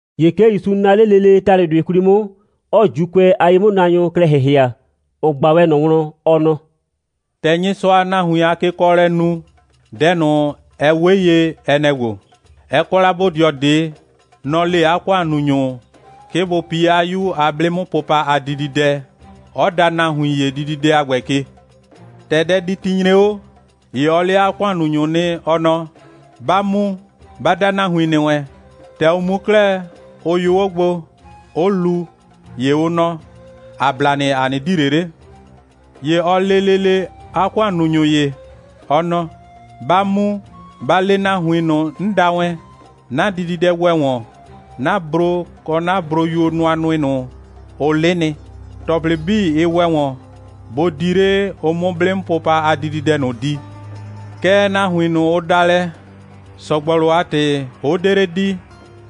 ‑Ye 'ke ‑Yusu naa 'le lele ‑talʋdʋɩ 'kwli 'mʋ, 'ɔɔ ‑Juukʋɛ a ye'mʋnaanyʋ klɛ ‑hɩhɩa, ‑ʋ ꞊gba wɛn ꞊nɔ wlɔn, ɔ nɔ: «‑Tɛ Nyɩsʋaa nahuin a win a kekɔɔlɛ nu, dɛ ꞊nʋ, ɛ 'we ye, ɛ nɛ‑ ‑gbo: Ɛ kɔ la bodɩɔ ꞊de. Nɔ‑ le 'a ‑kʋannunyʋ, 'ke bʋ pi 'a 'yu a 'blɩ'mʋpʋpa a dididɛ, 'ɔ da nahuin ‑ye dididɛ a ‑gbɛ ke. ‑Tɛ dɛditi nyre 'o, ‑ye ɔ le 'a ‑kʋannunyʋ nɩ, ɔ nɔ: Ba mu, ba da nahuin ‑nɩ wɛn. ‑Tɛ ʋ mu 'klɛɛ, ʋ yʋ 'o gbo, 'ʋ lu, ‑ye ʋ nɔ: ‑A bla nɩ, ‑a 'nɩ di ꞊le 'le. ‑Ye ɔ le lele 'a ‑kʋannunyʋ ‑ye, ɔ nɔ: Ba mu, ba le nahuin ꞊nʋ, 'n da wɛn, 'na dididɛ ‑wɛ ‑wɔn, 'na bro kɔ broyuo nʋanʋɩ ꞊nʋ, ʋ 'lɩ nɩ. ‑Tɔplɩ 'bii, ɩ ‑wɛ ‑wɔn. Bʋ di 'le, ʋ 'mʋ 'blɩ'mʋpʋpa a dididɛ ꞊nʋ di. Kɛɛ, nahuin ꞊nʋ, ʋ da lɛ, ‑sɔgbɔlʋ a ‑tɩ 'ʋ 'de 'le di,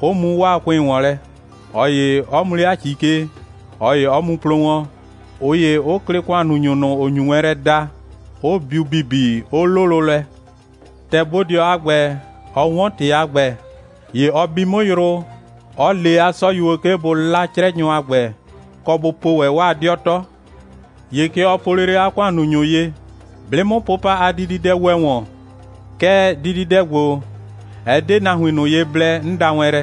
'ʋ mu 'waa ‑kʋɩn ‑wɔn lɛ, ꞊ɔ ‑ye 'ɔ mu 'le 'a ‑ci ke, ꞊ɔ ‑ye 'ɔ mu plo wɔn, ꞊ʋ ‑ye 'ʋ klɩ ‑kʋannunyʋ ꞊nʋ, ‑ʋ nyu wɛn lɛ da, 'ʋ biu ‑bibi, 'ʋ 'lʋlʋ lɛ. ‑Tɛ bodɩɔ a ‑gbɛ, ɔ 'wɔn ‑tɩ a ‑gbɛ, ‑ye ɔ bi 'mʋ yrʋ, 'ɔ le 'a 'sɔyuo, 'ke bʋ 'la 'crɛnyʋ a ‑gbɛ, kɔ bʋ po ‑wɛ 'waa 'dɩɔ 'tɔ. ‑Ye kɛ ɔ po lele 'a ‑kʋannunyʋ ye: 'Blɩ'mʋpʋpa a dididɛ ‑wɛ ‑wɔn. Kɛɛ, dididɛ ‑gbo, ɛ 'de nahuin ꞊nʋ ye blɛ, 'n da wɛn lɛ.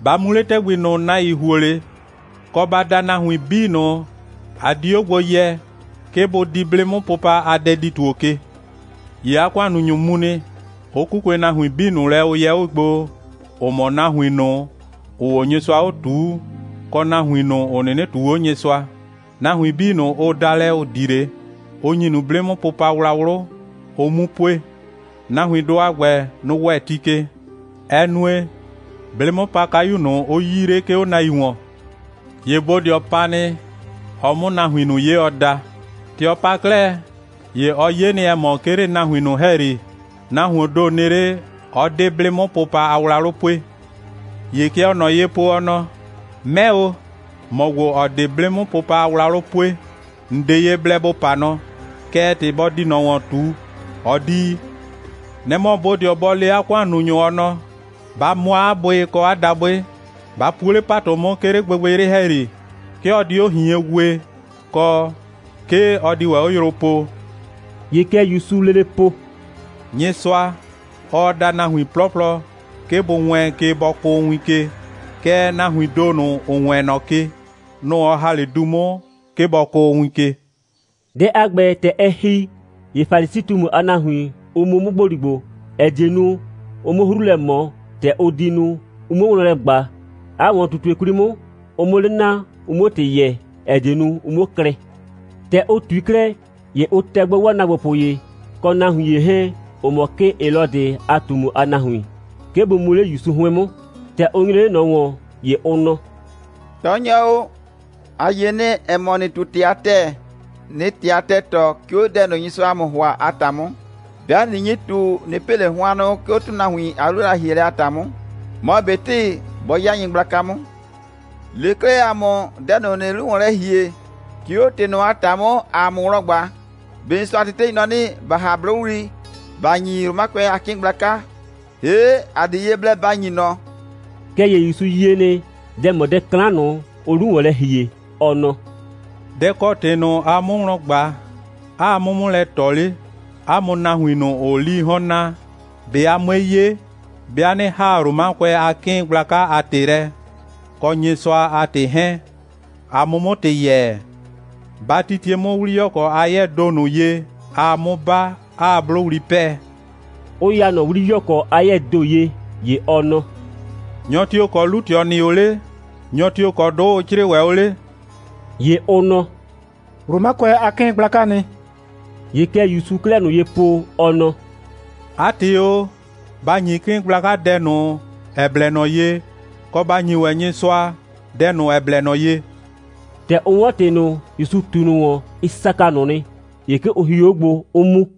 Ba mu 'le ‑tɛgbi ꞊nʋ, nahuin ‑huo 'le, kɔ, ba da nahuin 'bii ꞊nʋ, a di 'o gbo yɛ, 'ke bʋ di 'blɩ'mʋpʋpa a dɛdi‑tuo ke. ‑Ye 'a ‑kʋannunyʋ mu nɩ, 'ʋ 'kukue nahuin 'bii ꞊nʋ lɛ, ʋ yɛ 'o gbo, ‑ʋ mɔ nahuin ꞊nʋ, ‑ʋʋ 'o Nyɩsʋa ꞊tuu, kɔ nahuin ꞊nʋ, ‑ʋ 'nɩnɩ ꞊tuu 'o Nyɩsʋa. (Nahuin 'bii ꞊nʋ, ʋ da lɛ, ‑ʋ di 'le, ʋ ‑nyi ꞊nʋ 'blɩ'mʋpʋpa a wlawlʋ, ʋ 'mu pue.) Nahuindʋ a ‑gbɛ, nʋ‑ ‑wɛ ti ke. Ɛ nue, 'blɩ'mʋpakayu ꞊nʋ, 'ʋ 'yii 'le, 'ke 'o nahuin ‑wɔn. ‑Ye bodɩɔ pa nɩ, ɔ 'mʋ nahuin ꞊nʋ 'ye, ɔ da. ‑Tɛ ɔ pa 'klɛɛ, ‑ye ɔ 'ye nɩ, ‑ɛ mɔ, 'ke 'le nahuin ꞊nʋ ‑hɛyri, nahuoon ‑do nɩ 'le, 'ɔ 'de 'blɩ'mʋpʋpa a wlawlʋ pue. ‑Ye kɛ ɔɔ ꞊nɔ ye po, ɔ nɔ: 'Mɛ o, ‑mɔ ‑gbo, ‑ɔ 'de 'blɩ'mʋpʋpa a wlawlʋ pue, ‑n 'de ye blɛ ‑bo pa nɔ. Kɛɛ, ‑tɩ bɔ di ꞊nɔ ‑wɔn ꞊tu, ɔ 'di yi. Nɛ‑ mɔ bodɩɔ bɔ le 'a ‑kʋannunyʋ, ɔ nɔ: Ba mʋa 'a bʋɩ kɔ 'a dabʋɩ. Ba puo 'le ‑patʋ 'mʋ, 'ke 'le gbɩgbɩyrɩ ‑hɛyri. 'Ke ɔ di 'o ꞊hien wee, kɔ, 'ke ɔ di ‑wɛ 'o yrʋ poo.» ‑Ye kɛ ‑Yusuu lele po: «Nyɩsʋa, ɔɔ da nahuin 'plɔplɔ, 'ke bʋ wɛɛn ke, bɔ kʋʋ win ke, kɛɛ, nahuiin ‑do ꞊nʋ, ‑ʋ wɛɛn ꞊nɔ ke, nʋ‑ ɔ ‑ha 'le du 'mʋ, 'ke bɔ kʋʋ win ke.» Dɛ a ‑gbɛ, ‑tɛ ɛ ‑hi, ‑ye Falisi꞊tumu a nahuin, ʋ mu 'mʋ ‑gboligbo, ‑ɛ die nu, ʋ 'mʋ 'hru lɛ ꞊mɔ, ‑tɛ ʋ di nu, ʋ 'muo wlɔn lɛ ꞊gba, 'a ‑wɔn꞊tutue 'kwli 'mʋ, ʋ 'mʋ 'le naa, ʋ 'muo ‑tɩ yɛɛ, ‑ɛ die nu, ʋ 'muo klɩ. ‑Tɛ ʋ ꞊tui 'klɛɛ, ‑ye ʋ tɛ gbo 'waa ‑naagbopʋ ‑ye, kɔ nahuin ‑ye 'hɛɛn, ‑ʋ mɔ 'kɩɩn Helɔdɩ a ꞊tumu a nahuin, 'ke bʋ mu 'le ‑Yusu 'hʋɩn 'mʋ. ‑Tɛ ʋ nyre 'le ꞊nɔ ‑wɔn, ‑ye ʋ nɔ: «Tɔɔnyɔ o, ‑a yie nɩ, ‑ɛ mɔ, ‑nɩɩ ꞊tu ‑tɩ a ‑tɛɛ, ꞊nɩɩ ‑tɩ a ‑tɛɛ tɔɔ, 'ke 'o dɛ ꞊nʋ, Nyɩsʋaa ‑a mʋ ‑hʋa a ‑ta 'mʋ. 'Bɩa ꞊nɩ nyi ꞊tu, ꞊nɩ pɩ ꞊le hʋannʋ, 'ke 'o ‑tʋnahuon a 'lu a lɛ‑hielɛ a ‑ta 'mʋ, mɔ ꞊betɩ bɔ 'ya nyɩgblaka 'mʋ. Le 'klɛɛ ‑a mʋ dɛ ꞊nʋ, ‑nɩɩ 'lu ‑wɔn lɛ ‑hie, 'ke 'o ‑tɩ ꞊nʋ a ‑ta 'mʋ, ‑aa ‑mʋ wlɔn mu ꞊gba: ꞊Be Nyɩsʋa a tetei nɔ 'nɩ, ‑ba ‑ha 'blʋwli, ‑ba ‑nyi Romakʋɛ a 'kɩɩn gblaka, ‑hee' ‑a 'de ye blɛ ‑ba ‑nyi ꞊nɔ?» Kɛɛ ‑ye ‑Yusu yie nɩ, dɛ‑ mɔ dɛ 'klan ꞊nʋ, ʋʋ 'lu ‑wɔn lɛ ‑hie, ɔ nɔ: «Dɛ‑ kɔ ‑tɩ ꞊nʋ, aa 'mʋ wlɔn ꞊gba, 'aa 'mʋ 'mʋ lɛ ꞊tɔ 'le, 'a mʋ nahuin ꞊nʋ, ‑ʋʋ 'lii 'hɔn naa? ꞊Be a 'mue 'ye, 'bɩa 'nɩ ‑haa Romakʋɛ a 'kɩɩn gblaka a ‑tɩ lɛ, kɔ Nyɩsʋa a ‑tɩ 'hɛɛn, a 'mʋ 'mʋ ‑tɩ yɛɛ? Ba titie 'mʋ 'wliyɔkɔ a 'yɛɛ ‑do ꞊nʋ ye, aa 'mʋ 'ba, 'aa 'blʋwli 'pɛɛ,» 'ʋ ya ꞊nɔ 'wliyɔkɔ a 'yɛɛ ‑do ye. ‑Ye ɔ nɔ: «Nyɔ tio‑ kɔ 'lu꞊tɩɔ nɩ 'o 'le? Nyɔ tio‑ kɔ 'dʋ ʋ 'crɩɩ ‑wɛ 'o 'le?» ‑Ye ʋ nɔ: «Romakʋɛ a 'kɩɩn gblakaa nɩ.» ‑Ye kɛ ‑Yusuu 'klɛɛ ꞊nʋ ye po, ɔ nɔ: «'A ‑tɩ o, ba ‑nyi 'kɩɩn gblaka dɛ ꞊nʋ, ‑ɛ blɛ ꞊nɔ ye, kɔ, ba ‑nyi ‑wɛ Nyɩsʋa dɛ ꞊nʋ, ‑ɛ blɛ ꞊nɔ ye!» ‑Tɛ ʋ 'wɔn ‑tɩ ꞊nʋ, ‑Yusu ꞊tu ꞊nʋ ‑wɔn, ɩ saka ꞊nʋ nɩ. ‑Ye 'ke ʋ hio 'o gbo, 'ʋ mu.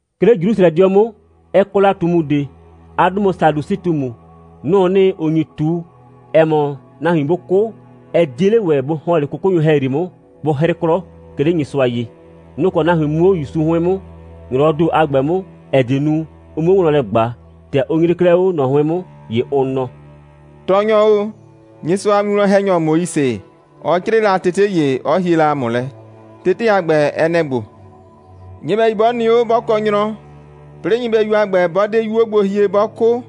'Ke 'le Jrusrɛdɩɔ 'mʋ, ɛ kɔ la ꞊tumu ꞊de. 'A 'dʋ mɔ Sadusɩ꞊tumu. Nʋ‑ʋ nɩ, ‑ʋ nyi ꞊tu, ‑ɛ mɔ, nahuin 'bʋ 'kʋ, ɛ 'die 'le ‑wɛ bʋ ‑hɔn 'le 'kʋkʋnyʋ ‑hɛyri 'mʋ, bʋ 'hrɩ 'klɔ, 'ke 'le Nyɩsʋa ye. Nʋ‑ kɔ nahuin mu 'o ‑Yusu 'hʋɩn 'mʋ, ‑nyrɔwɔɔ ‑do a ‑gbɛ 'mʋ, ‑ɛ die nu, ʋ 'muo wlɔn lɛ ꞊gba. ‑Tɛ ʋ nyre 'klɛɛ 'o ꞊nɔ 'hʋɩn 'mʋ, ‑ye ʋ nɔ: «Tɔɔnyɔ o, Nyɩsʋa a winwlɔn‑hɛnyɔ Moise, ɔ 'crɩɩ la tete ‑ye, 'ɔ hie la ‑a mʋ lɛ. Tete a ‑gbɛ, ɛ nɛ‑ ‑gbo: Nyɩbɛyu 'bɔ nɩ 'o, 'bɔ kɔ nyrɔ, 'plɩɩ nyɩbɛyu a ‑gbɛ, 'bɔ 'de 'yuo gbo hie, 'bɔ 'kʋ,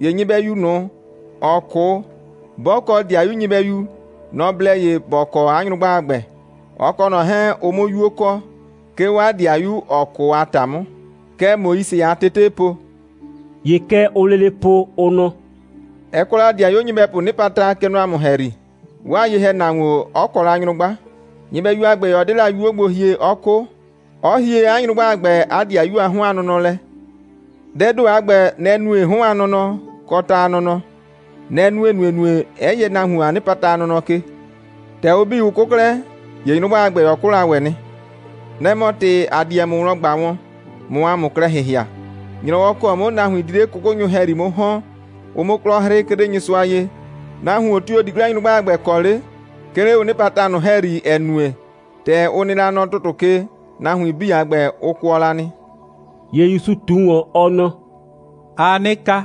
‑ye nyɩbɛyu ꞊nʋ, ‑ɔ 'kʋ, 'bɔ kɔ 'dɩayu nyɩbɛyu, nɔ‑ blɛ ye ‑bɔ kɔ 'a nyrʋgba a ‑gbɛ, ɔ kɔ ꞊nɔ 'hɛɛn, ʋ 'mʋ 'yuo kɔ, 'ke 'o 'a 'dɩayu, ‑ɔ 'kʋ a ‑ta 'mʋ. Kɛ Moise a tetee po.» ‑Ye kɛ ʋʋ lele po, ʋ nɔ: «Ɛ kɔ la ‑dɩayuo nyɩbɛpʋʋ 'nɩpata, kɛ nɔ ‑a mʋ ‑hɛyri, 'waa ye‑hɛnahuon 'ɔ kɔ nyrʋgba, nyɩbɛyu a ‑gbɛ, 'ɔ 'de 'yuo gbo hie, 'ɔ 'kʋ, 'ɔ hie 'a nyrʋgba a ‑gbɛ 'a ‑dɩayu a 'hɔn a nɔnɔ lɛ. Dɛɛ ‑do a ‑gbɛ, nɛ‑ nue 'hɔn a nɔnɔ, kɔ ta a nɔnɔ. Nɛ‑ nue ‑nuenue, 'ɛ yɛ nahuon a 'nɩpata a nɔnɔ ke. ‑Tɛ ʋ 'bii, ʋ 'kʋ 'klɛɛ, ‑ye nyrʋgba a ‑gbɛ, ɔ 'kʋ la ‑wɛ nɩ. Nɛ‑ mɔ ‑tɩ, ‑a di wɛn ‑mʋ wlɔn ꞊gba wɔn, ꞊mʋ ‑a mʋ klɛ ‑hɩhɩa. ‑Nyrɔwɔ ‑kɔ 'mʋ nahuin di 'le 'kʋkʋnyʋ ‑hɛyri 'mʋ ‑hɔn, ʋ 'mʋ 'klɔ 'hrɩ, 'ke 'le Nyɩsʋa ye, nahuon tio‑ di 'klɛɛ nyrʋgba a ‑gbɛ kɔ 'le, 'ke 'le ʋ 'nɩpata ꞊nʋ ‑hɛyri, ‑ɛ nue, ‑tɛ ʋ nɩ la nɔ ‑tʋtʋ ke, nahuin 'bii a ‑gbɛ, ʋ kʋɔ la nɩ.» ‑Ye ‑Yusu ꞊tu ‑wɔn, ɔ nɔ: «Aa 'nɩ ka,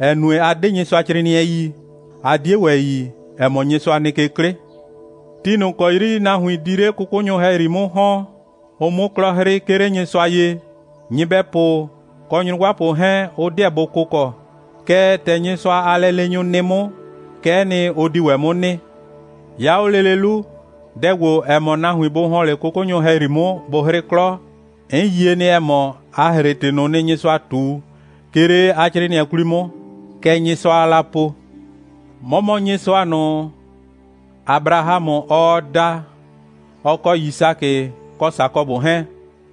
‑ɛ nue, a 'de Nyɩsʋacrɩɩnɩɛ yi, 'a 'die ‑wɛ yi, ‑ɛ mɔ, Nyɩsʋa nɩ ke 'klɩ. Ti ꞊nʋ ‑kɔ 'yri nahuin di 'le 'kʋkʋnyʋ ‑hɛyri 'mʋ ‑hɔn, ʋ 'mʋ 'klɔ 'hrɩ, 'ke 'le Nyɩsʋa ye, nyɩbɛpʋ kɔ nyrʋgbapʋ 'hɛɛn, ʋ 'deɛ bʋ kʋkɔ. Kɛɛ, ‑tɛ Nyɩsʋa a lɛleenyʋ nɩ 'mʋ, kɛ'ɛ nɩ, ʋ di ‑wɛ 'mʋ nɩ. 'Ya 'o lele 'lu, dɛ ‑gbo, ‑ɛ mɔ nahuin bʋ ‑hɔn 'le 'kʋkʋnyʋ ‑hɛyri 'mʋ, bʋ 'hrɩ 'klɔ, 'n yie nɩ, ‑ɛ mɔ, a ‑hre ‑tɩ ꞊nʋ nɩ, Nyɩsʋa ꞊tu, 'ke 'le 'a 'crɩɩnɩɛ 'kwli 'mʋ. Kɛ Nyɩsʋaa la po: 'Mɔ mɔ Nyɩsʋa ꞊nʋ, Abrahamʋ, ɔɔ da, ɔ kɔ Yisakɩ, kɔ Sakɔbʋ 'hɛɛn.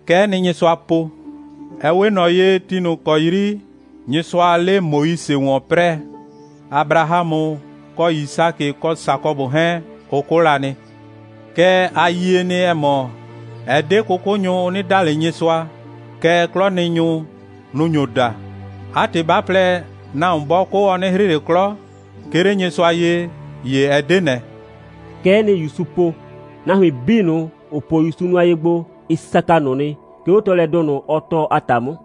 Kɛ'ɛ nɩ, Nyɩsʋa po. Ɛ 'we ꞊nɔ ye, ti ꞊nʋ ‑kɔ 'yri Nyɩsʋaa 'le Moise ‑wɔn 'prɛɛ, Abrahamʋ kɔ Yisakɩ kɔ Sakɔbʋ 'hɛɛn, ʋ 'kʋ la nɩ. Kɛɛ, ‑a yie nɩ, ‑ɛ mɔ, ɛ 'de 'kʋkʋnyʋ, ʋ 'nɩ da ꞊le Nyɩsʋa, kɛɛ, 'klɔnɩnyʋ, nʋ‑ nyo da. ('A ‑tɩ, 'ba plɛ, nahuon 'bɔ 'kʋ, ɔ 'nɩ 'hrɩ ꞊le 'klɔ, 'ke 'le Nyɩsʋa ye, ‑ye ɛ 'de ꞊nɛ.)» Kɛ'ɛ nɩ, ‑Yusu po. Nahuin 'bii ꞊nʋ, ‑ʋ po ‑Yusu nʋa ye gbo, ɩ saka ꞊nʋ nɩ, 'ke 'o tɔɔlɛdʋ ꞊nʋ, ɔ tɔɔ a ‑ta 'mʋ.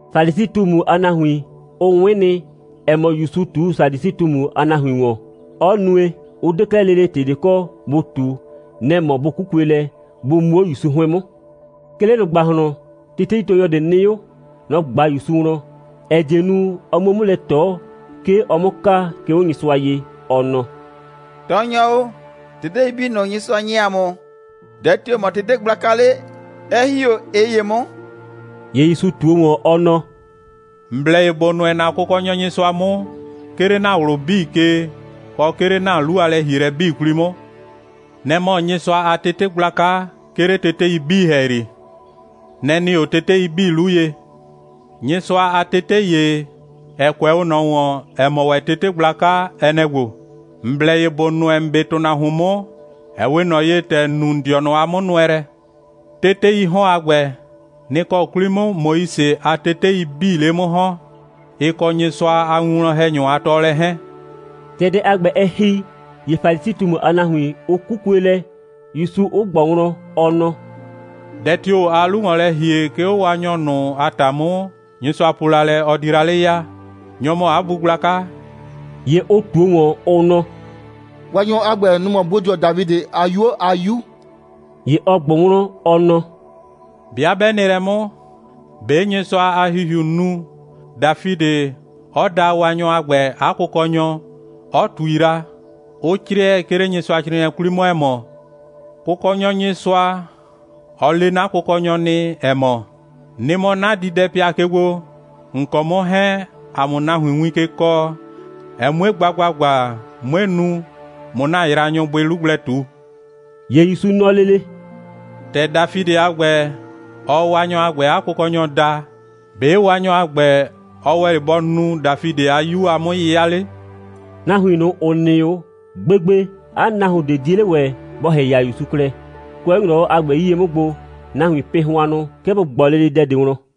Falisi꞊tumu a nahuin, ʋ 'wɩn nɩ, ‑ɛ mɔ, ‑Yusu ꞊tu Sadusɩ꞊tumu a nahuin ‑wɔn, 'ɔ nue, 'ʋ 'de 'klɛɛ lele ‑tɩ ꞊de kɔ, bʋ ꞊tu. Nɛ‑ mɔ bʋ 'kukue lɛ, bʋ mu 'o ‑Yusu 'hʋɩn 'mʋ. 'Ke 'le ꞊nʋ ‑gbahlɔn, teteitɔɔnyɔ ꞊de nɩ 'o. Nɔ‑ ꞊gba ‑Yusu wlɔn, ‑ɛ die nu, ɔ 'muo 'mʋ lɛ ꞊tɔ, 'ke ɔ 'mʋ ka, 'ke 'o Nyɩsʋa ye, ɔ nɔ: «Tɔɔnyɔ o, tetei 'bii ꞊nʋ, Nyɩsʋa ‑nyi ‑a mʋ, dɛ tio‑ mɔ tete gblaka 'le, 'ɛ ‑hi 'o ꞊ɩ ‑ye 'mʋ?» «‑Ye ‑Yusu ꞊tuo ‑wɔn, ɔ nɔ: ‑N blɛ ye ‑bo nʋɛ ‑na Kʋkɔnyɔ Nyɩsʋa 'mʋ, 'ke 'le ‑na ꞊wlʋ 'bii ke, kɔ, 'ke 'le ‑na 'lu a lɛ‑hielɛ 'bii 'kwli 'mʋ. Nɛ‑ mɔ Nyɩsʋa a tete gblaka, 'ke 'le tetei 'bii ‑hɛyri. Nɛ‑ nɩ 'o tetei 'bii 'lu ye. Nyɩsʋa a tete ‑ye, ‑ɛ kʋɛ 'o ꞊nɔ ‑wɔn, ‑ɛ mɔ ‑wɛ tete gblaka, ɛ nɛ‑ ‑gbo: ‑N blɛ ye ‑bo nʋɛ ‑n 'be ‑tʋnahuon 'mʋ, ‑ɛ 'we ꞊nɔ ye, ‑tɛ ‑n nu ‑n dɩɔnʋ a 'mʋnʋɛlɛ. Teteii 'hɔn a ‑gbɛ, nɩ‑ kɔ 'kwli 'mʋ Moise a tetei 'bii 'le 'mʋ ‑hɔn, ɩ kɔ Nyɩsʋa a winwlɔn‑hɛnyʋ a tɔɔlɛ 'hɛɛn.» ‑Tɛ dɛ a ‑gbɛ, ɛ ‑hi, ‑ye Falisi꞊tumu a nahuin, ʋ 'kukue lɛ, ‑Yusu 'ʋ ꞊gbʋ wlɔn, ɔ nɔ: «Dɛ tio‑ aa 'lu ‑wɔn lɛ ‑hie, 'ke 'o Waanyɔ ꞊nʋ a ‑ta 'mʋ, Nyɩsʋa po la lɛ, ɔ di la 'le ya? Nyɔ‑ mɔ 'a bu gblaka?» ‑Ye ʋ ꞊tuo ‑wɔn, ʋ nɔ: «Waanyɔ a ‑gbɛ, nɔ‑ mɔ bodɩɔ Dafidɩ a 'yuo a 'Yu.» ‑Ye ɔ ꞊gbʋ wlɔn, ɔ nɔ: «'Bɩa 'bɛ nɩ lɛ 'mʋ, ‑be' Nyɩsʋa a ‑Hihiu nu, Dafidɩ 'ɔ daa Waanyɔ a ‑gbɛ 'a Kʋkɔnyɔ, 'ɔ ꞊tui la, 'ʋ 'crɩɛ, 'ke 'le Nyɩsʋacrɩɩnɩɛ 'kwli 'mʋ, ‑ɛ mɔ: Kʋkɔnyɔ Nyɩsʋa, ɔ le 'na kʋkɔnyɔ nɩ, ‑ɛ mɔ: Nɩ mɔ 'na diidɛpɩa ke gbo, ‑n kɔ 'mʋ 'hɛɛn, ‑a 'mʋ nahuin win ke kɔɔ, ɛ 'mue gba ‑gbagba, 'mue nu, ꞊mʋ ‑na yraanyʋ bʋɩ 'lu gblɛ ꞊tu.» ‑Ye ‑Yusu nɔ lele: «‑Tɛ Dafidɩ a ‑gbɛ, ɔɔ Waanyɔ a ‑gbɛ 'a Kʋkɔnyɔ daa, ‑be' Waanyɔ a ‑gbɛ, ɔ ‑wɛ 'le bɔ nu Dafidɩ a 'Yu a 'mʋ'yɩya 'le?» Nahuin ꞊nʋ, ‑ʋ nɩ 'o, gbegbe 'a nahuon ꞊de 'die 'le ‑wɛ bɔ ‑hɩhɩa ‑Yusu klɛ. Kʋɛ 'o ‑nyrɔwɔ a ‑gbɛ 'yie 'mʋ gbo, nahuiin pɩ hʋannʋ, 'ke bʋ ꞊gbɔ lele dɛ ꞊de wlɔn.